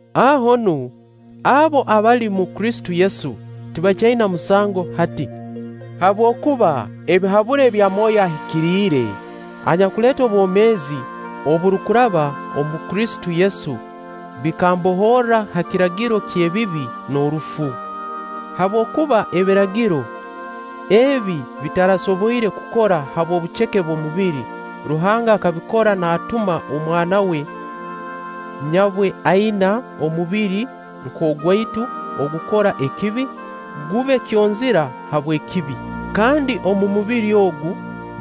Aho nu, abo abali omu Kristo Yesu, tibakyaina musango hati. Habwokuba ebihaburo ebya Mwoyo Ahikiriire anyakuleeta obwomeezi oburukuraba omu Kristo Yesu bikambohorra ha kiragiro ky'ebibi n'orufu. Habwokuba Ebiragiro, ebi bitarasoboire kukora habw'obuceke bw'omubiri, Ruhanga akabikora naatuma Omwana we nyabwe aina omubiri nk'ogwaitu ogukora ekibi, gube kyonzira habw'ekibi. Kandi omu mubiri ogu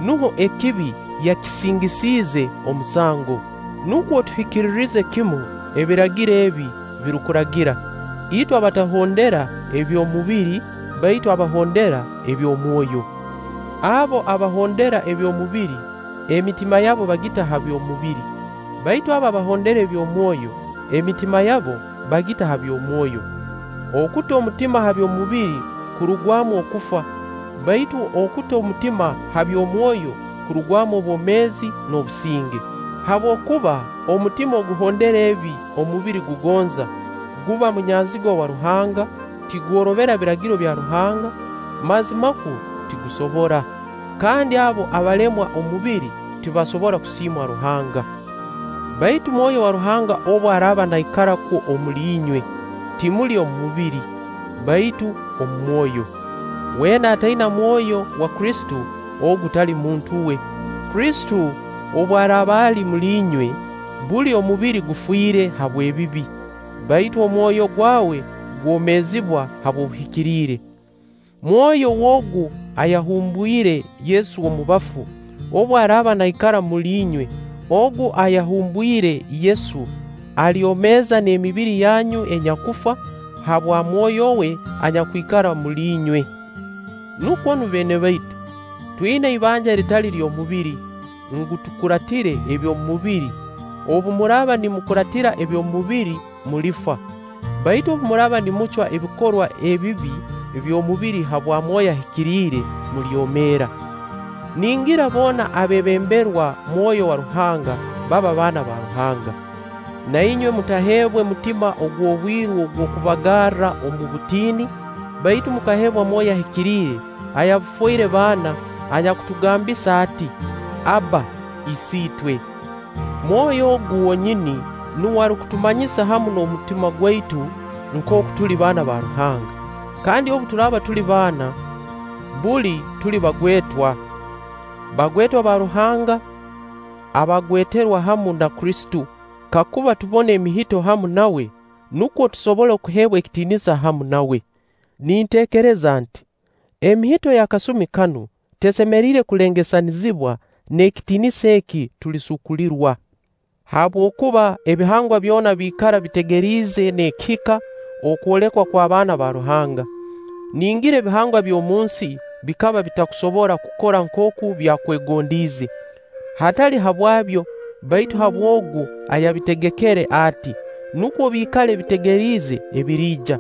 nuho ekibi yakisingisiize omusango. Nukwo tuhikiririze kimu Ebiragiro ebi birukuragira, itwe abatahondera eby'omubiri, baitu abahondera ebya Mwoyo. Abo abahondera eby'omubiri, emitima yabo bagita ha by'omubiri, baitu abo abahondera ebya Mwoyo, emitima yabo bagita ha bya Mwoyo. Okuta omutima ha by'omubiri kurugwamu okufa; baitu okuta omutima ha bya Mwoyo kurugwamu obwomeezi n'obusinge. Habwokuba omutima oguhondera ebi omubiri gugonza, guba munyanzigwa wa Ruhanga; tigworobera Biragiro bya Ruhanga, mazimakwo tigusobora. Kandi abo abalemwa omubiri tibasobora kusiimwa Ruhanga. Baitu Mwoyo wa Ruhanga obu araaba naikara kwo omuli inywe, timuli omu mubiri, baitu omu Mwoyo. Weena ataina Mwoyo wa Kristo, ogu tali muntu we. Kristo obu araaba ali omuli inywe, buli omubiri gufiire habw'ebibi, baitu omwoyo gwawe gwomeezibwa habw'obuhikiriire. Mwoyo w'Ogu ayahumbwire Yesu omu bafu, obu araaba naikara omuli inywe, Ogu ayahumbwire Yesu, alyomeeza n'emibiri yanyu enyakufa, habwa Mwoyo we anyakwikara omuli inywe. Nukwo nu beene baitu, twina ibanja eritali ly'omubiri, ngu tukuraatire eby'omubiri obu muraaba nimukuraatira eby'omubiri mulifa; baitu obu muraaba nimucwa ebikorwa ebibi by'omubiri habwa Mwoyo Ahikiriire, mulyomeera. Ningira boona abeebemberwa Mwoyo wa Ruhanga, baba baana ba Ruhanga. Na inywe mutaheebwe mutima ogw'obwiru ogw'okubagarra omu butiini; baitu mukaheebwa Mwoyo Ahikiriire ayabafoire baana, anyakutugambisa ati: “Abba, Isiitwe!” Mwoyo ogu wonyini nuwe arukutumanyisa hamu n'omutima gwaitu, nkooku tuli baana ba Ruhanga. Kandi obu turaaba tuli baana, buli tuli bagwetwa. Bagwetwa ba Ruhanga abagweterwa hamu na Kristo, kakuba tubona emihito hamu nawe, nukwo tusobole kuheebwa ekitiinisa hamu nawe. Ninteekereza nti: Emihito y'akasumi kanu tesemeriire kulengesanizibwa n'ekitiinisa eki tulisuukulirwa. Habwokuba ebihangwa byona biikara bitegeriize n'ekihika okwolekwa kw'abaana ba Ruhanga. Ningira ebihangwa eby'omunsi bikaba bitakusobora kukora nkooku byakwegondiize; hatali habwabyo, baitu habw'Ogu ayabitegekere ati-nukwo biikale bitegeriize ebiriija.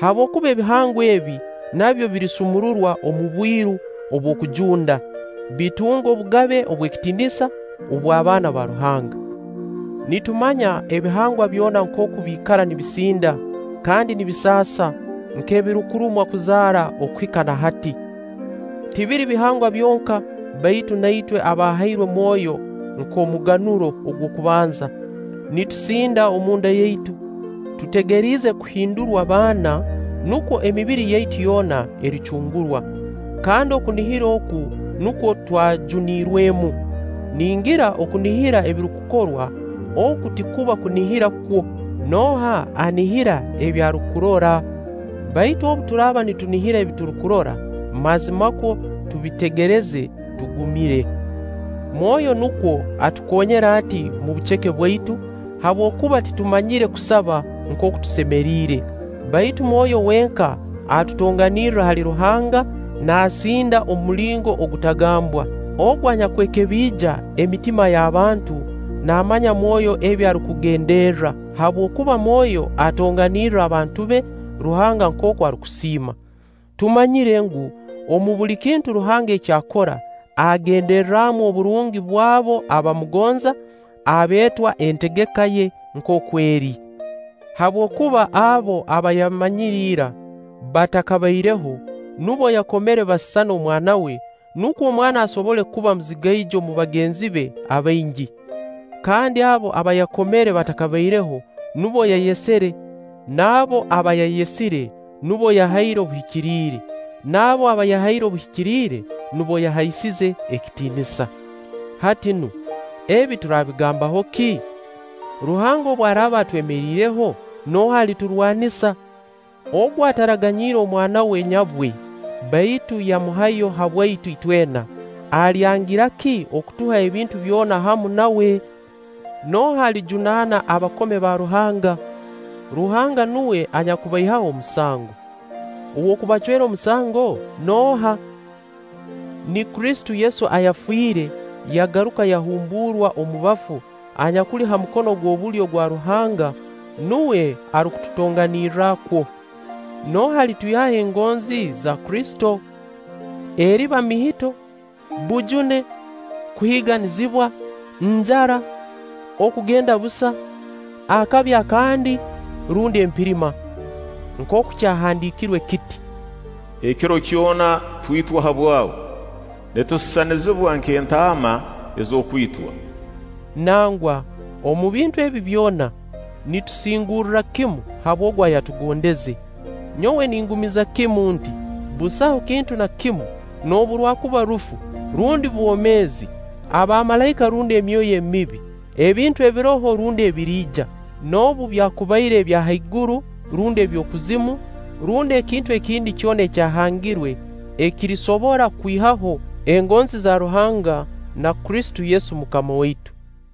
Habwokuba ebihangwa ebi nabyo birisumururwa omu bwiru obw'okujunda, bitunge obugabe obw'ekitiinisa obw'abaana ba Ruhanga. Nitumanya ebihangwa byona nkooku biikara nibisinda kandi nibisaasa nk'ebirukurumwa kuzaara okuhika na hati. Tibiri bihangwa byonka, baitu na itwe abaahairwe Mwoyo nk'omuganuro ogw'okubanza, nitusinda omu nda yaitu, tutegeriize kuhindurwa baana, nubwo emibiri yaitu yoona ericungurwa. Kandi okunihira oku nukwo twajuniirwemu. Ningira okunihira ebirukurorwa, oku tikuba kunihira kwo. Nooha anihira ebi arukurora? Baitu obu turaaba nitunihira ebi tutarukurora, mazimakwo tubitegereza tugumire. Mwoyo nukwo atukoonyere ati mu buceke bwaitu; habwokuba titumanyire kusaba nkooku tusemeriire; baitu Mwoyo wenka atutonganirra hali Ruhanga, naasinda omu mulingo ogutagambwa. Ogu anyakwekebiija emitima y'abantu naamanya Mwoyo ebi arukugenderra; habwokuba Mwoyo atonganirra abantu be, Ruhanga nkooku arukusiima. Tumanyire ngu, omu buli kintu Ruhanga eki akora, agenderramu oburungi bw'abo abamugonza, abeetwa entegeka ye nkooku eri. Habwokuba abo aba yamanyire ira, batakabaireho, nubo yakomere basisane Omwana we, nukwo Omwana asobole kuba muzigaijo omu bagenzi be abaingi. Kandi abo aba yakomere batakabaireho, nubo yayesire; n'abo aba yayesire, nubo yahaire obuhikiriire; n'abo aba yahaire obuhikiriire, nubo yahaisize ekitiinisa. Hati nu, ebi turabigambaho ki? Ruhanga obu araaba atwemeriireho, nooha aliturwanisa? Ogu ataraganyiire Omwana we nyabwe, baitu yamuhayo habwaitu itwena, alyangira ki okutuha ebintu byona hamu nawe? Nooha alijunaana abakome ba Ruhanga? Ruhanga nuwe anyakubaihaho omusango. Ow'okubacwera omusango nooha? Ni Kristo Yesu ayafiire, yagaruka yahumbuurwa omu bafu, anyakuli ha mukono gw'obulyo ogwa Ruhanga, nuwe arukututonganirra kwo! Nooha alitwihaho engonzi za Kristo? Eriba mihito, bujune, kuhiiganizibwa, njara, okugenda busa, akabi akandi rundi empirima? Nkooku kyahandiikirwe kiti: “Ekiro kyona twitwa habwawe; nitusisanizibwa nk'etaama ez'okwitwa.” Nangwa, omu bintu ebi byona nitusingurra kimu habw'Ogu ayatugondeze. Nyowe ningumiza kimu nti: Busaho kintu na kimu noobu rwakuba rufu, rundi bwomeezi, abamalaika rundi emyoyo emibi, ebintu ebiroho rundi ebiriija, noobu byakubaire ebya ha iguru rundi eby'okuzimu, rundi ekintu ekindi kyona ekyahangirwe ekirisobora kutwihaho engonzi za Ruhanga na Kristo Yesu MUKAMA waitu.